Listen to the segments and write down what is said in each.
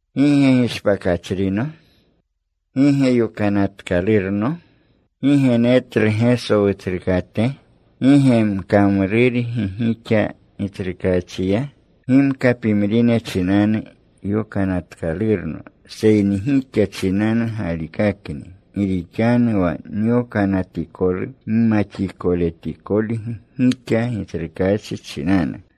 ¿Gi ge gishpakachrino? ¿Gi ge yokanatkalurno? ¿Gi ge netlu Geso Wutsrukate? ¿Gi ge nkamrurgi gixa Gitsrukaachiya? Gimka pimrine chinanu yokanatkalurno, seyni gixa chinanu galikakakni. Gi rixanu wa nyokanatikolu gimaxikoletikolgi gixa Gitsrukaachi chinanu.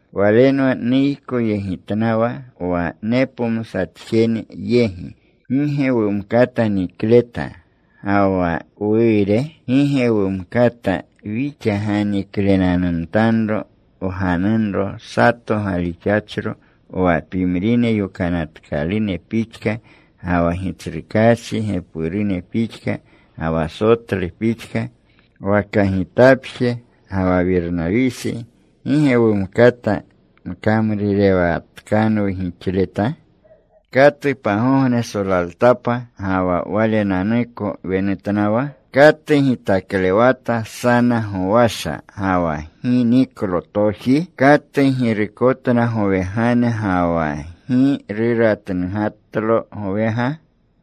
Walenwa nuykoyegitnawa wa nepomsatjene yegi. ¿Gi ge wumkata nikleta ga wa wuure? ¿Gi ge wumkata wixa ganiklenanumtanro wganunro sato galixachro, wa pimrine yokanatkalune pixka, ga wa Gitsrukaachi gepurune pixka, ga wa Sotlu pixka? ¿Waka gitapje ga wa Wirnawisi gi ge wumkata mkamruurewatkanwu gixleta? ¿Katu pagogne solaltapa ga wa walenanuko wenutnawa? ¿Katu gitaklewata sana gowasha ga wa gi niklu toji? ¿Katu girukotna gowegane ga wa gi ruratnugatlo gowega?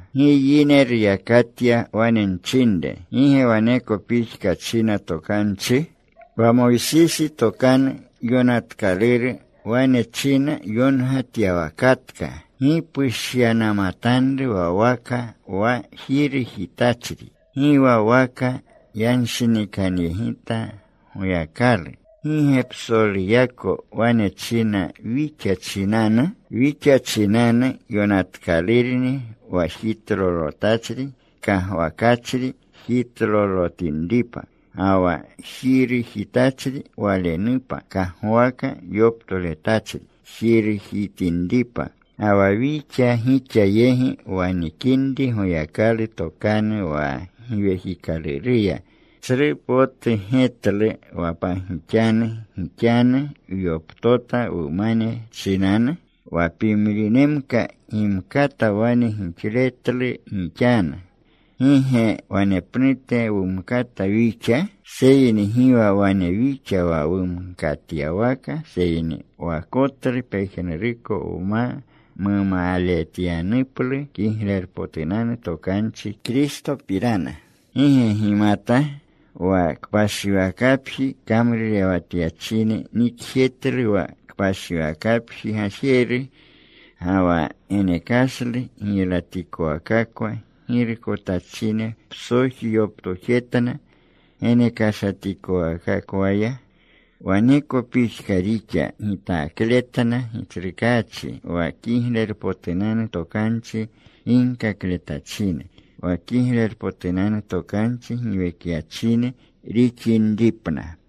Gi yine ruyakatya wane nchinre. ¿Gi ge waneko pixka china Tokanchi? Wa Moysisi Tokanu Yokanatkaluru wane china yongatyawakanatkaluru, “Gi pushyanamatanru wa waka wa jirujitachri.” Gi wa waka yanshinikanyegita Goyakalu. ¿Gi ge psoluyako wane china wixa chinanu? Wixa chinanu yonatkalurni, wa jitlolotachri kagwakachri jitlolotinripa. Ga wa jirujitachri walenupa kagwaka yoptoletachri jirujitinripa. Ga wa wixa gixa yegi wanikinri Goyakalu tokanu wa Giwekikaluruya, ¿tsru potu getlu wa pagixanu gixanu wyoptota wumane chinanu? Wa pimrinemka gimkata wane gixletlu gixanu, ¿gi ge wanepnute wumkata wixa? Seyni gi wa wane wixa wa wumkatyawaka. Seyni wakotlu pejnuruko wma mumaletyanuplu Kiglerpotunanu Tokanchi Kristopirana. ¿Gi ge gimata? Wa kpashiwakapji kamrurewatyachine nikjetluna wa kpashiwakapji gajeru. Ga wa genekashlu giylatikowakakwa girukotachine psoji yoptojetna genekashatikowakakwaya. Waneko pixka rixa gitakletna Gitsrukaachi wa Kiglerpotunanu Tokanchi ginkakletachine, wa Kiglerpotunanu Tokanchi giwekyachine rixinripna.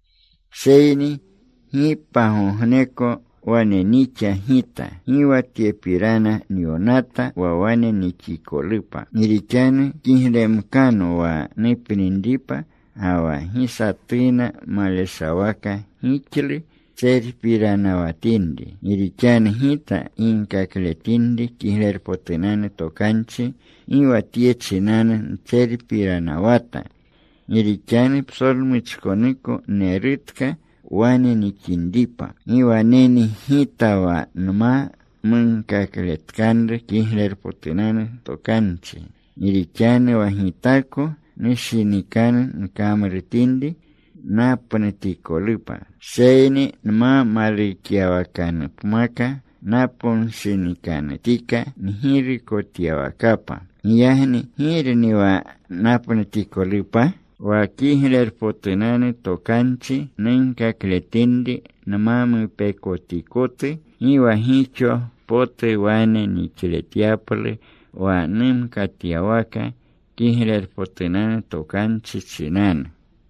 Seyni gi pagogneko wane nixa gita. Gi wa tyepirana nyonata wa wane nixikolupa. Gi rixanu kiglemkano wa nupninripa, ga wa gi satuna maleshawaka gixlu ntserpiranawatinri. Gi rixanu gita ginkakletinri Kiglerpotunanu Tokanchi, gi wa tye chinanu ntserpiranawata. Gi rixanu psolmuchkonuko nerutka wane nixinripa. ¡Gi waneni gita wa nma munkakletkanru Kiglerpotunanu Tokanchi! Gi rixanu wa gitako nushinikanu nkamrutinri, napnutikolupa. Seyni nma malukyawakanupmaka, naponshinikanutika ngirukotyawakapa. Giyagni ¿girni wa napnutikolupa? Wa Kiglerpotunanu Tokanchi nunkakletinri nma mupekotikotu, gi wa gixo potu wane nixletyaplu wa numkatyawaka Kiglerpotunanu Tokanchi chinanu.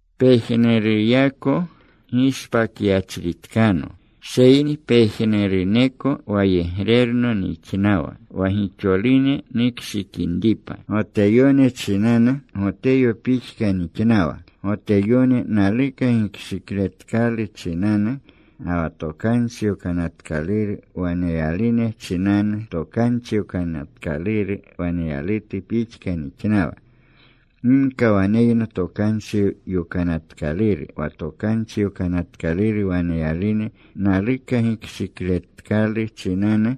Pejnuruyako gishpakyachritkano. Seyni pejnuruneko wayegrerno nixnawa, wa gixolune nukshikinripa. Goteyone chinanu, Goteyo pixka nixnawa, Goteyone naluka gikshikletkalu chinanu. Ga wa Tokanchi Yokanatkaluru waneyalune chinanu, Tokanchi Yokanatkaluru waneyalutu pixka nixnawa, gimka waneyno Tokanchi Yokanatkaluru, wa Tokanchi Yokanatkaluru waneyalune naluka gikshikletkalu chinanu.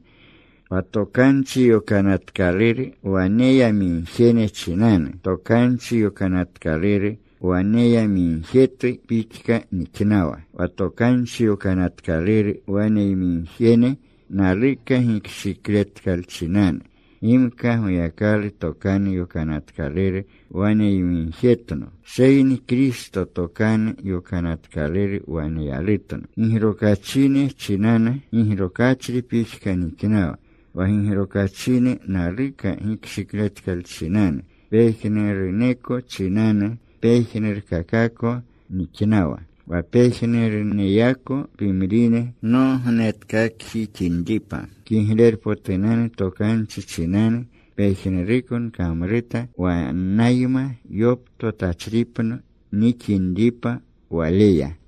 Wa Tokanchi Yokanatkaluru waneyamigjene chinanu, Tokanchi Yokanatkaluru waneyamigjetu pixka nixnawa, wa Tokanchi Yokanatkaluru waneyamigjene naluka gikshikletkalchinanu. Gimka Goyakalu Tokanu Yokanatkaluru waneyamigjetno, seyni Kristo Tokanu Yokanatkaluru waneyalutno. Gigrokachine chinanu gigrokachri pixka nixnawa wa gigrokachine naluka gikshikletkalchinanu. Pejnuruneko chinanu, pejnurkakako nixnawa, wa pejnuruneyako pimrine nognetkakjixinripa. Kiglerpotunanu Tokanchi chinanu pejnuruko nkamruta, wannayma yoptotachripno nixinripa waleya.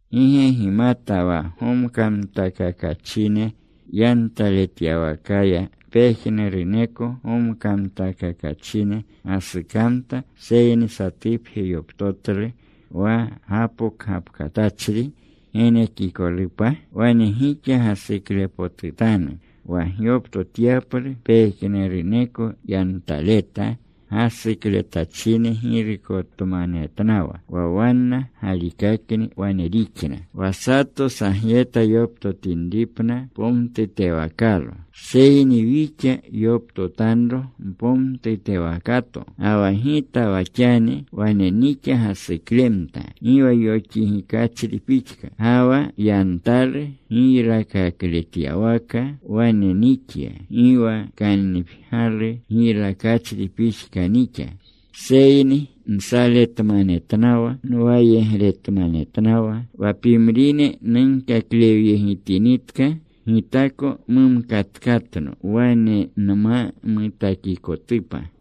¿Gi ge gimata wa gomkamtakakachine yantaletyawakaya pejnuruneko gomkamtakakachine gasukamta, seyni satupje yoptotlu wa gapokgapkatachri genekikolupa? Wane gixa gasuklepotutanu wa gyoptotyaplu. Pejnuruneko yantaleta gasukletachine girukotmanetnawa. Wa wanna galikakni wane rixna wa satu sagyeta yoptotinripna pomtutewakalo. Seyni wixa yoptotanro mpomtutewakato. Ga wa gita wa xani wane nixa gasuklemta gi wa yoxigikachri pixka. Ga wa yantalu giylakakleyawaka wane nixya, gi wa kannipgyalu giylakachri pixka nixa. Seyni nsaletmanetnawa. Nwayegretmanetnawa. Wa pimrine nunkaklewyegitinitka, gitako mumkatkatno wane nma mutakikotupa.